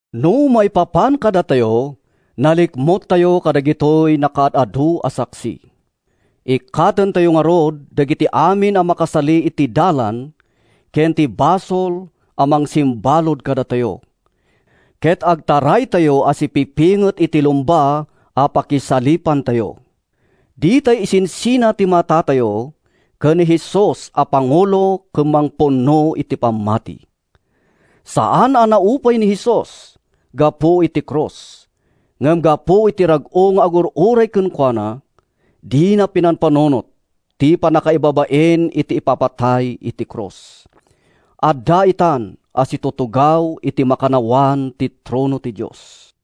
No maipapan kadatayo, nalikmuttayo kadagitoy nakaad-adu a saksi. Ikkatentayo ngarud dagiti amin a makasali iti dalan ken ti basol a mangsimbalud kadatayo, ket agtaraytayo a sipipinget iti lumba a pakisalipantayo. Ditay isinsina ti matatayo ken ni Jesus a pangulo ken mangpunno iti pammati. Saan a naupay ni Jesus gapu iti krus. Ngem gapu iti rag-o nga agur-uray kenkuana, dina pinampanunot ti pannakaibabain iti ipapatay iti krus. Adda itan a situtugaw iti makannawan ti trono ti Dios.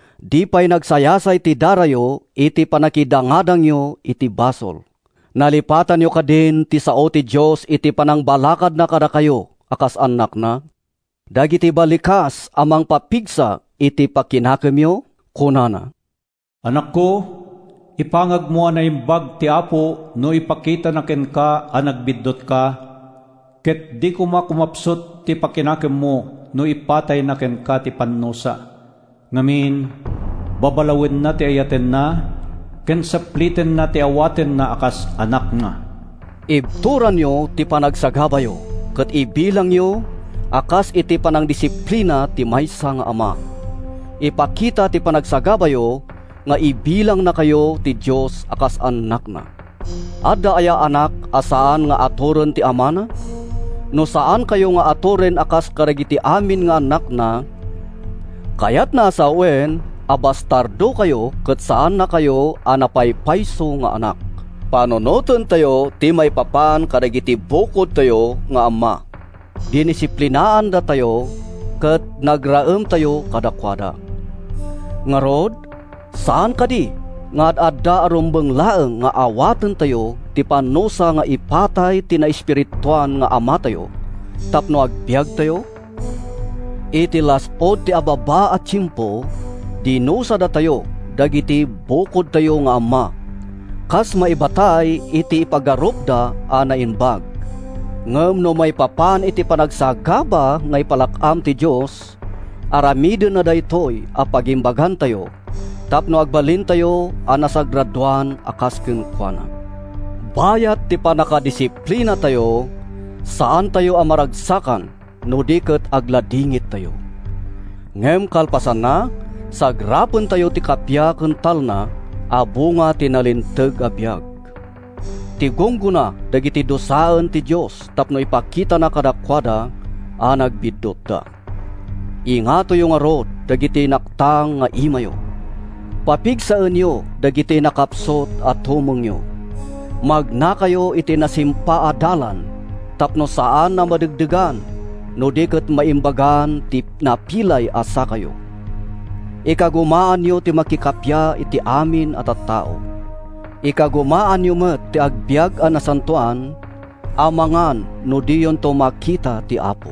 Di pay nagsayasay ti darayo iti pannakidangadangyo iti basol. Nalipatanyo kadin ti sao ti Dios iti panangbalakadna kadakayo a kas annakna—dagiti balikas a mangpapigsa iti pakinakemyo? Kunana: “Anakko, ipangagmo a naimbag ti Apo no ipakitana kenka a nagbiddutka Ket di koma kumapsut ti pakinakemmo no ipatayna kenka ti pannusa. Ngamin, babalawenna ti ayatenna ken saplitenna ti awatenna a kas anakna.” Ibturanyo ti panagsagabayo ket ibilangyo a kas iti panangdisiplina ti maysa nga ama. Ipakita ti panagsagabayo nga ibilangnakayo ti Dios a kas annakna. Adda aya anak a saan nga aturen ti amana? No saannakayo nga aturen a kas kadagiti amin nga annakna, kayatna a sawen a bastardokayo ket saannakayo a napaypayso nga annak. Panunotentayo ti maipapan kadagiti bukodtayo nga amma: dinisiplinaandatayo ket nagraemtayo kadakuada. Ngarud, saan kadi nga ad-adda a rumbeng laeng nga awatentayo ti pannusa nga ipatay ti naespirituan nga Amatayo tapno agbiagtayo? Iti las-ud ti ababa a tiempo, dinusadatayo dagiti bukodtayo nga amma, kas maibatay iti ipagarupda a naimbag. Ngem no maipapan iti panagsagaba nga ipalak-am ti Dios, aramidenna daytoy a pagimbagantayo tapno agbalintayo a nasagradoan a kas kenkuana. Bayat ti pannakadisiplinatayo, saantayo a maragsakan no di ket agladingittayo. Ngem kalpasanna, sagrapentayo ti kappia ken talna a bunga ti nalinteg a biag: ti gunggona dagiti dusaen ti Dios tapno ipakitana kadakuada a nagbiddutda. Ingatoyo ngarud dagiti naktang nga imayo! Papigsaenyo dagiti nakapsut a tumengyo! Magnakayo iti nasimpa a dalan tapno saan a madegdegan no di ket maimbagan ti napilay a sakayo. Ikagumaanyo ti makikappia iti amin a tattao. Ikagumaanyo met ti agbiag a nasantoan amangan no diyonto makita ti Apo.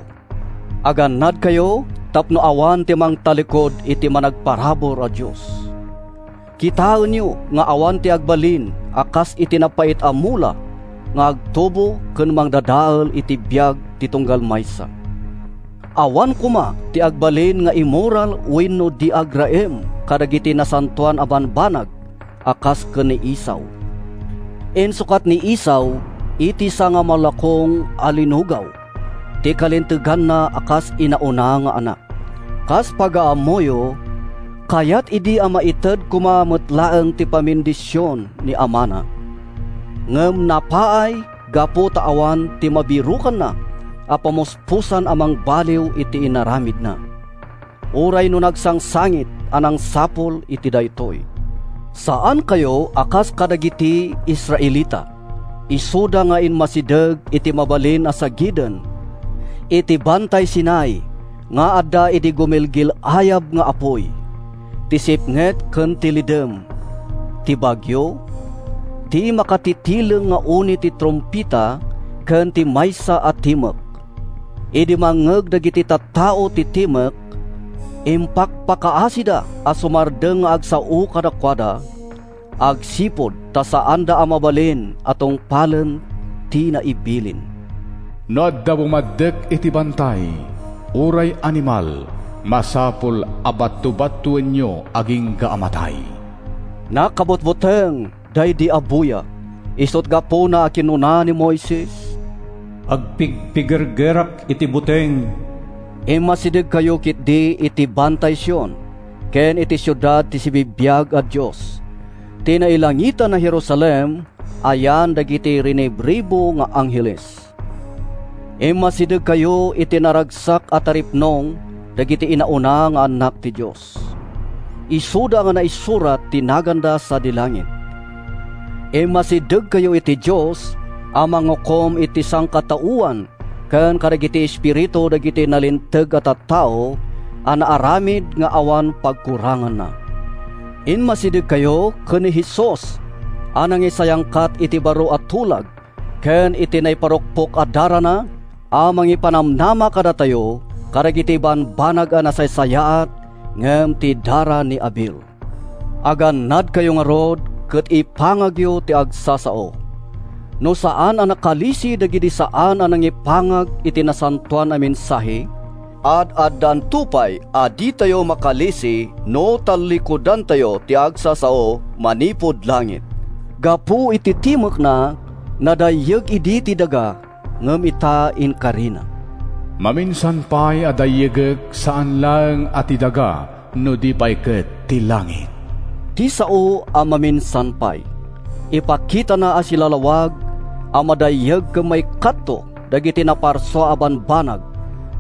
Agannadkayo tapno awan ti mangtallikud iti managparabur a Dios. Kitaenyo nga awan ti agbalin a kas iti napait a mula nga agtubo ken mangdadael iti biag ti tunggal maysa. Awan koma ti agbalin nga immoral wenno di agraem kadagiti nasantoan a bambanag a kas ken ni Esau. Insukat ni Esau iti sangamalukong a linugaw ti kalinteganna a kas inauna nga anak. Kas pagaammoyo, kayatna idi a maited koma met laeng ti pamendision ni amana, ngem napaay gapu ta awan ti mabirokanna a pamuspusan a mangbaliw iti inaramidna, uray no nagsangsangit a nangsapul iti daytoy. Saankayo a kas kadagiti Israelita, isuda nga immasideg iti mabalin a sagiden—iti Bantay Sinai nga adda idi gumilgil-ayab nga apuy, ti sipnget ken ti lidem, ti bagio, ti makatitileng nga uni ti trumpeta ken ti maysa a timek. Idi mangngeg dagiti tattao ti timek, impakpakaasida a sumardeng nga agsao kadakuada agsipud ta saanda a mabalin a tungpalen ti naibilin: “No adda bumaddek iti bantay, uray animal, masapul a bato-batoenyo agingga a matay.” Nakabutbuteng daydi a buya, isut’ gapuna a kinuna ni Moises, “Agpigpigergerak iti buteng!” Immasidegkayo ketdi iti Bantay Sion ken iti siudad ti sibibiag a Dios, ti nailangitan a Jerusalem a yan dagiti rinibribu nga angheles. Immasidegkayo iti naragsak a taripnong dagiti inauna nga annak ti Dios, isuda a naisurat ti naganda sadi langit. Immasidegkayo iti Dios a mangukom iti sangkataoan ken kadagiti espiritu dagiti nalinteg a tattao a naaramid nga awan pagkuranganna. Immasidegkayo ken ni Jesus a nangisayangkat iti baro a tulag ken iti naiparukpok a darana a mangipanamnama kadatayo kadagiti bambanag a nasaysayaat ngem ti dara ni Abel. Agannadkayo ngarud ket ipangagyo ti agsasao. No saan a nakalisi dagidi saan a nangipangag iti nasantoan a mensahe, ad-addanto pay a ditayo makalisi no tallikudantayo ti agsasao manipud langit! Gapu iti timekna, nadayyeg idi ti daga ngem ita inkarina, “Maminsan pay a dayyegek saan laeng a ti daga no di pay ket ti langit.” Ti sao a “maminsan pay” ipakitana a silalawag a madayyeg ken maikkatto dagiti naparsua a bambanag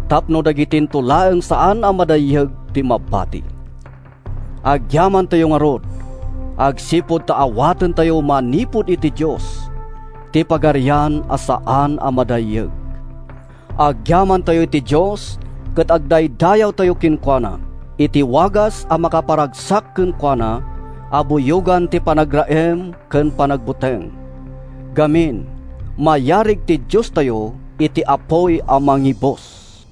tapno dagitinto laeng saan a madayyeg ti mabati. Agyamantayo ngarud agsipud ta awatentayo manipud iti Dios ti pagarian a saan a madayyeg. Agyamantayo iti Dios ket agdaydayawtayo kenkuana iti wagas a makaparagsak kenkuana a buyogan ti panagraem ken panagbuteng. Ngamin, mayarig ti Diostayo iti apuy a mangibus.